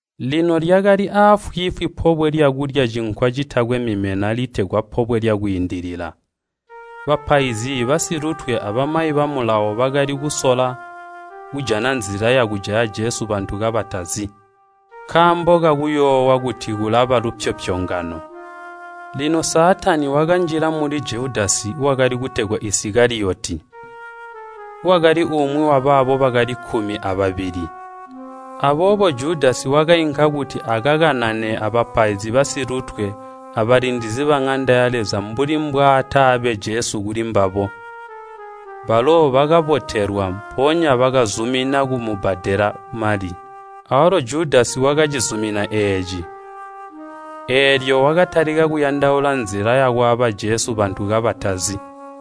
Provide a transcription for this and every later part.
Lino lyakali aafwiifwi pobwe lyakulya Cinkwa Citakwe Mimena litegwa Pobwe lya Kwiindilila. Bapaizi basilutwe abamayi ba Mulawo bakali kusola kujana nzila yakujaya Jesu bantu kabatazi, nkaambo kakuyoowa kuti kulaba lupyopyongano. Lino Saatani wakanjila muli Judasi wakali kutegwa Isikaliyoti, wakali umwi wabaabo bakali kkumi ababili. Aboobo Judasi wakainka kuti akakanane abapaizi basilutwe abalindizi baŋanda ya Leza mbuli mbwataabe Jesu kulimbabo. Balo bakabotelwa, mpoonya bakazumina kumubbadela mali. Awalo Judasi wakacizumina eeci. Eelyo wakatalika kuyandaula nzila yakwaaba Jesu bantu kabatazi.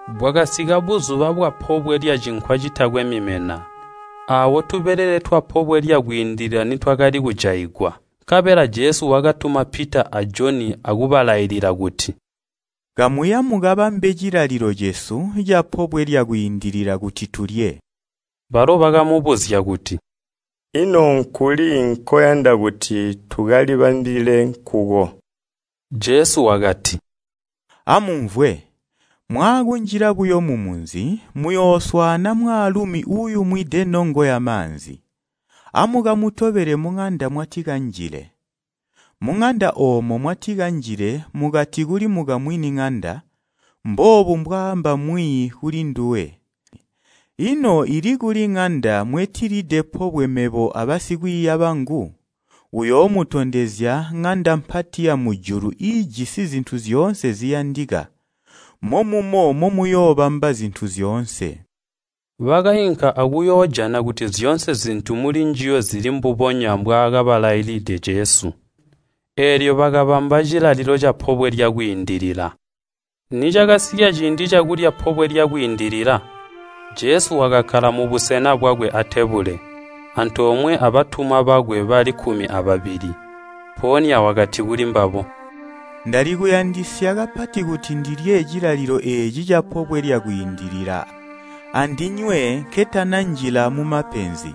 Bwakasika buzuba bwapobwe lya Cinkwa Citakwe Mimena, aawo tubelele twa Pobwe lya Kwiindilila nitwakali kujaigwa. Nkabela Jesu wakatuma Pita a Joni akubalailila kuti, “Kamuya mukabambe cilalilo cesu ca Pobwe lya Kwiindilila kuti tulye.” Balo bakamubuzya kuti, “Ino nkuli nkoyanda kuti tukalibambile nkuko?” Jesu wakati, “Amumvwe! Mwaakunjila buyo mumunzi, muyooswaana mwaalumi uuyumwide nongo yamaanzi. Amukamutobele muŋanda mwatikanjile, muŋanda oomo mwatikanjile mukati kuli mukamwini ŋanda, ‘Mboobu mbwaamba Mwiiyi kulinduwe, ino ili kuli ŋanda mwetilide pobwe mebo abasikwiiya bangu?’ Uyoomutondezya ŋanda mpati yamujulu iijisi zintu zyoonse ziyandika, momumo momuyoobamba zintu zyoonse.” Bakainka akuyoojana kuti zyoonse zintu mulinjiyo zili mbubonya mbwaakabalaililide Jesu. Eelyo bakabamba cilalilo ca Pobwe lya Kwiindilila. Nicakasika ciindi cakulya pobwe lyakwiindilila, Jesu wakakkala mubusena bwakwe atebule, antoomwe abatumwa bakwe bali kkumi ababili. Mpoonya wakati kulimbabo, “Ndali kuyandisya kapati kuti ndilye cilalilo eeci ca Pobwe lya Kwiindilila andinywe nketananjila mumapenzi.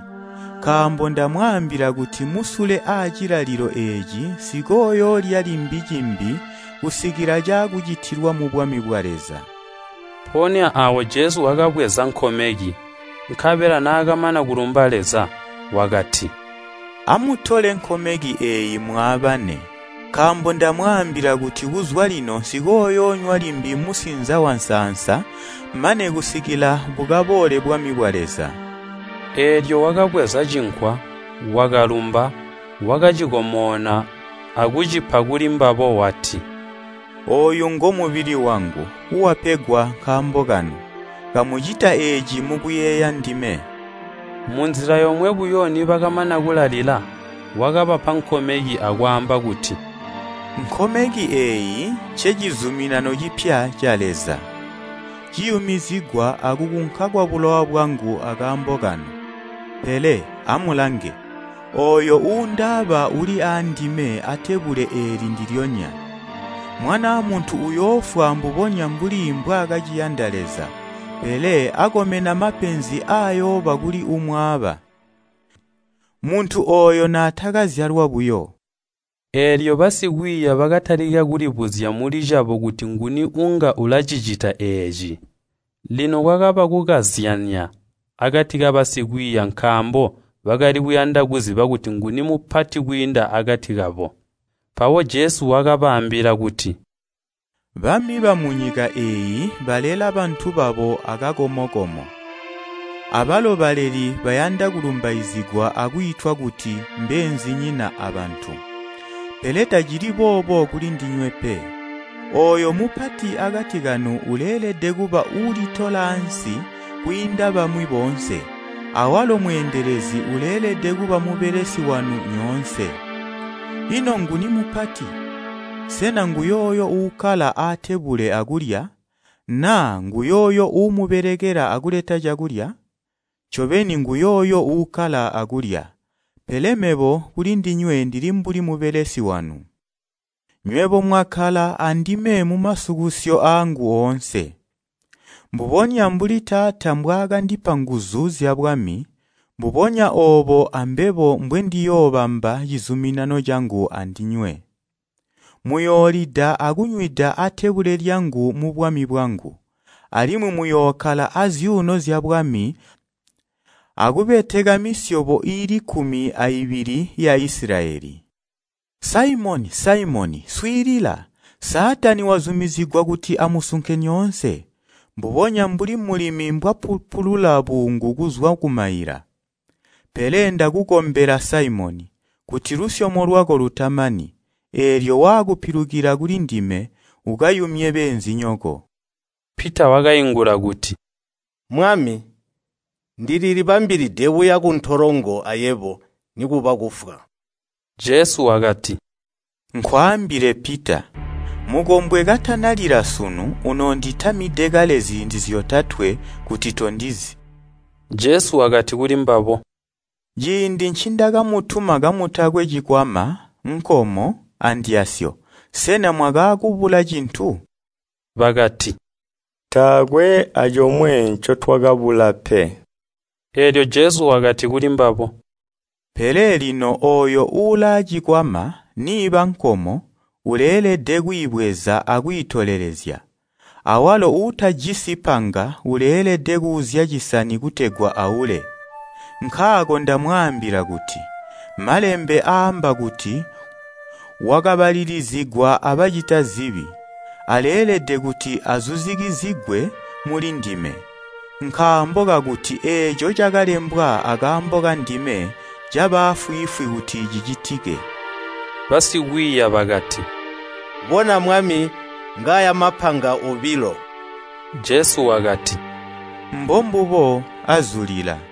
Nkaambo ndamwaambila kuti musule aacilalilo eeci nsikooyoolya limbi cimbi kusikila caakucitilwa mubwami bwa Leza.” Mpoonya aawo Jesu wakabweza nkomeki, nkabela naakamana kulumba Leza, wakati, “Amutole nkomeki eeyi mwaabane, nkaambo ndamwaambila kuti kuzwa lino nsikooyoonywa limbi musinza wansansa mane kusikila bukaboole bwami bwa Leza.” Eelyo wakabweza cinkwa, wakalumba, wakacikomona akucipa kulimbabo wati, “Ooyu ngomubili wangu, [wapegwa nkaambo kanu. Kamucita eeci mukuyeeya ndime.” Munzila yomwe buyo nibakamana kulalila, wakabapa nkomeki akwaamba kuti, “Nkomeki eeyi ncecizuminano cipya ca Leza, ciyumizigwa akukunka kwabulowa bwangu akaambo kanu.] “Pele, amulange! Ooyo uundaaba uli aandime atebule eeli ndilyonya! Mwanaa Muntu uyoofwa mbubonya mbuli mbwaakaciyanda Leza, pele akomena mapenzi aayooba kuli uumwaaba!” Muntu ooyo naatakazyalwa buyo. Eelyo basikwiiya bakatalika kulibuzya mulicabo kuti nguni uunga ulacicita eeci. Lino kwakaba kukazyanya akati kabasikwiiya nkaambo bakali kuyanda kuziba kuti nguni mupati kwiinda akati kabo. Mpawo Jesu wakabaambila kuti, “Bami bamunyika eeyi balela bantu babo akakomo-komo, abalo baleli bayanda kulumbaizigwa akwiitwa kuti ‘Mbeenzinyina abantu.’ Pele tacili boobo kulindinywe pe. Ooyo mupati akati kanu uleelede kuba uulitola aansi kwiinda bamwi boonse, awalo mweendelezi uleelede kuba mubelesi wanu nyoonse. Ino nguni mupati? Sena nguyooyo uukkala aatebule akulya, naa nguyooyo uumubelekela akuleta cakulya? Ncobeni nguyooyo uukkala akulya. Pele mebo kulindinywe ndili mbuli mubelesi wanu. “Nywebo mwakkala andime mumasukusyo aangu oonse, mbubonya mbuli Taata mbwaakandipa nguzu zyabwami, mbubonya oobo ambebo mbwendiyoobamba cizuminano cangu andinywe. Muyoolida akunywida atebule lyangu mubwami bwangu, alimwi muyookkala azyuuno zyabwami akubeteka misyobo iili kkumi aibili ya Isilayeli. “Saimoni, Saimoni! Swiilila! Saatani wazumizigwa kuti amusunke nyoonse, mbubonya mbuli mulimi mbwapupulula buungu kuzwa kumaila. Pele ndakukombela, Saimoni, kuti lusyomo lwako lutamani. Eelyo waakupilukila kulindime, ukayumye beenzinyoko.” Pita wakaingula kuti, “Mwami, ndililibambilide kuya kuntolongo ayebo, nikuba kufwa.” Jesu wakati, “Nkwaambile, Pita, mukombwe katanalila sunu, unoonditamide kale ziindi zyotatwe kuti tondizi.” Jesu wakati kulimbabo, “Ciindi ncindakamutuma kamutakwe cikwama, nkomo, andyasyo, sena mwakaakubula cintu?” Bakati, “Taakwe acomwe ncotwakabula pe.” Eelyo Jesu wakati kulimbabo, “Pele lino ooyo uulaacikwama, niiba nkomo, uleelede kwiibweza akwiitolelezya, awalo uutajisi panga uleelede kuuzya cisani kutegwa aule. Nkaako ndamwaambila kuti, malembe aamba kuti, ‘Wakabalilizigwa abacita zibi,’ aleelede kuti azuzikizigwe mulindime. Nkaambo kakuti eeco cakalembwa akaambo kandime caba aafwiifwi kuti cicitike.” Basikwiiya bakati, “Bona! Mwami, ngaaya mapanga obilo!” Jesu wakati, “Mbombubo, azulila.”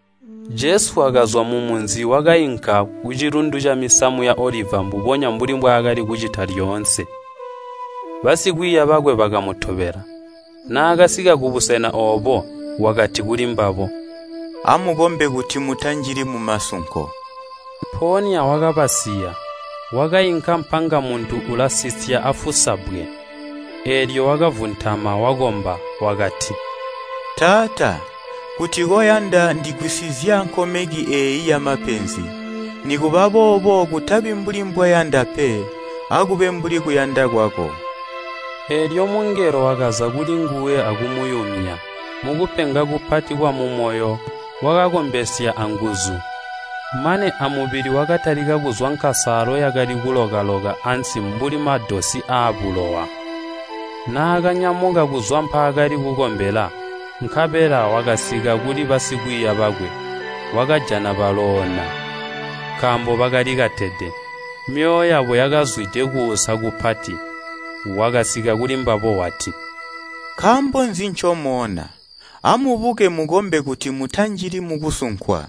Jesu wakazwa mumunzi wakainka kucilundu camisamu ya Oliva mbubonya mbuli mbwaakali kucita lyoonse, basikwiiya bakwe bakamutobela. Naakasika kubusena oobo, wakati kulimbabo, “Amukombe kuti mutanjili mumasunko.” Mpoonya wakabasiya, wakainka mpanga muntu ulasisya afusa bbwe, eelyo wakavuntama wakomba. Wakati, “Taata, kuti koyanda ndigwisizya nkomeki eeyi yamapenzi. Nikubaboobo kutabi mbuli mbweyanda pe, akube mbuli kuyanda kwako.” [ Eelyo mungelo wakaza kulinguwe akumuyumya. Mukupenga kupati kwamumoyo wakakombesya anguzu, mane amubili wakatalika kuzwa nkasaalo yakali kuloka-loka ansi mbuli madosi aabulowa.] Naakanyamuka kuzwa mpaakali kukombela, nkabela wakasika kuli basikwiiya bakwe, wakajana baloona, nkaambo bakalikatede, myoyo yabo yakazwide kuusa kupati. Wakasika kuli mbabo wati, “Nkaambo nzi ncomoona? Amubuke mukombe kuti mutanjili mukusunkwa.”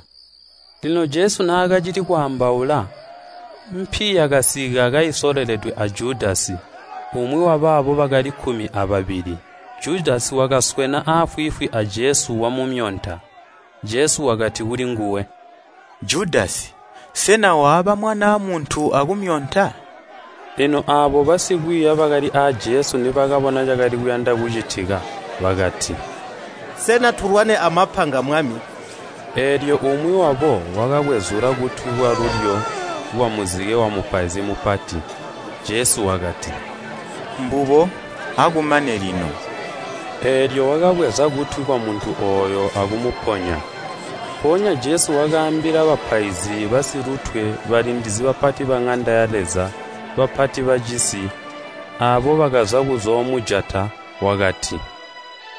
Lino Jesu naakacili kwaambaula, mpi yakasika kaisololedwe a Judasi, umwi wabaabo bali kkumi ababili. Judasi wakaswena aafwiifwi a Jesu wamumyonta. Jesu wakati kulinguwe, “Judasi, sena waaba Mwanaa Muntu akumyonta?” Lino aabo basikwiiya bakali aa Jesu nibakabona cakali kuyanda kucitika bakati, “Sena tulwane amapanga Mwami?” Eelyo umwi wabo wakakwezula kutwi kwalulyo kwamuzike wamupaizi mupati. Jesu wakati, “Mbubo! Akumane lino!” Eelyo wakabweza kutwi kwamuntu ooyo akumuponya. Mpoonya Jesu wakaambila bapaizi basilutwe, balindizi bapati baŋanda ya Leza, bapati bacisi, aabo bakaza kuzoomujata wakati,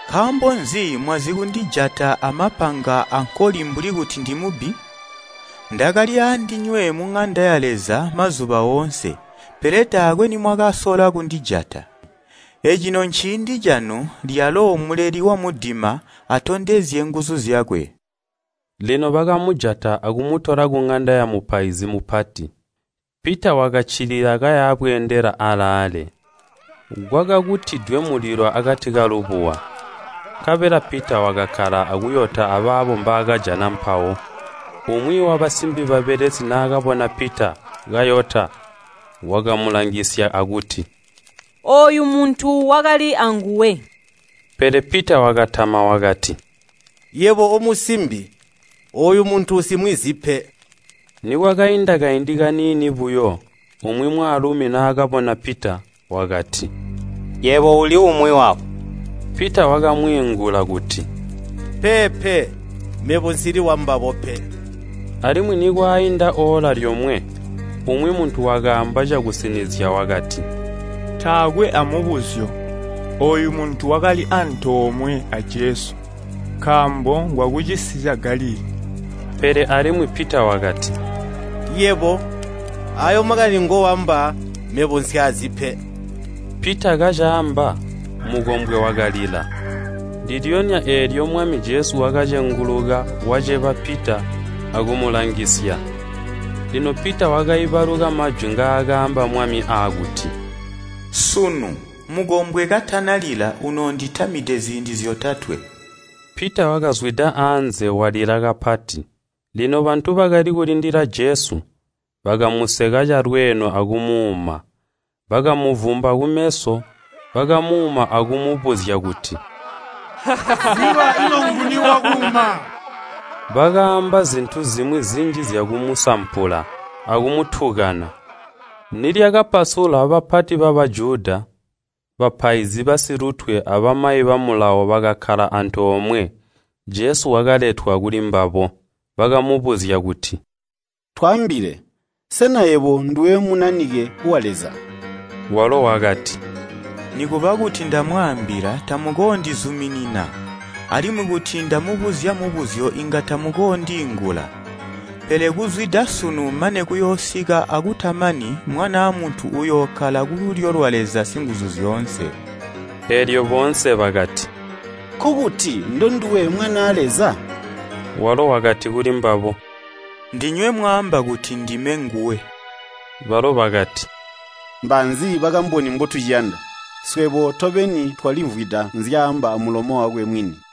“Nkaambo nzi mwazikundijata amapanga ankoli mbuli kuti ndimubbi? Ndakali aandinywe muŋanda ya Leza mazuba oonse, pele taakwe nimwakasola kundijata. Ecino nciindi cakuti muleli wamudima atondezye nguzu zyakwe.” Lino bakamujata akumutola kuŋanda yamupaizi mupati, Pita wakaccilila kaya bweendela alaale. Kwakakutwidwe mulilo akati kalubuwa, nkabela Pita wakakkala akuyota abaabo mbaakajana mpawo. Umwi wabasimbi babelesi naakabona Pita kayota wakamulangisya akuti, “Ooyu muntu wakali aanguwe!” Pele Pita wakatama wakati, “Yebo omusimbi, ooyu muntu nsimwizi pe!” Nikwakainda kaindi kaniini buyo, umwi mwaalumi naakabona Pita wakati, “Yebo uli umwi wabo!” Pita wakamwiingula kuti, “Peepe, mebo nsili wambabo pe!” Alimwi nikwainda oola lyomwe, umwi muntu wakaamba cakusinizya wakati, “Taakwe amubuzyo, ooyu muntu wakali antoomwe a Jesu, nkaambo ngwaakucisi ca Galilii.” Pele alimwi Pita wakati, “Yebo, aayo makani ngoamba mebo nsyaazi pe!” Pita kacaamba, mukombwe wakalila. Ndilyonya eelyo Mwami Jesu wakacenguluka waceba Pita akumulangisya. Lino Pita wakaibaluka majwi ngaakaamba Mwami aakuti, “Sunu mukombwe katanalila unoonditamide ziindi zyotatwe.” Pita wakazwida anze walila kapati. Lino bantu bakali kulindila Jesu, bakamuseka calweeno akumuuma. Bakamuvumba kumeso, bakamuuma akumubuzya kuti, “Ziba, ino nguni wakuuma?” Bakaamba zintu zimwi zinji zyakumusampula akumutukana. Nibwakaca, bapati ba Bajuda, bapaizi basilutwe, abamayi ba Mulawo bakakkala antoomwe, Jesu wakaletwa kulimbabo. Bakamubuzya kuti, “Twaambile, sena yebo nduwe Munanike wa Leza?” Walo wakati, “Nikuba kuti ndamwaambila tamukoondizuminina, alimwi kuti ndamubuzya mubuzyo inga tamukoodiingula. Pele kuzwida sunu mane kuyoosika akutamani Mwanaa Muntu uyookkala kululyo lwa Leza Singuzuzyoonse.” Eelyo boonse bakati, “Nkokuti ndonduwe Mwanaa Leza?” Walo wakati kulimbabo, “Ndinywe mwaamba kuti ndime nguwe.” Balo bakati, “Mbaanzi bakamboni mbotuciyanda! Swebo tobeni twalimvwida nzyaamba amulomo wakwe mwini!”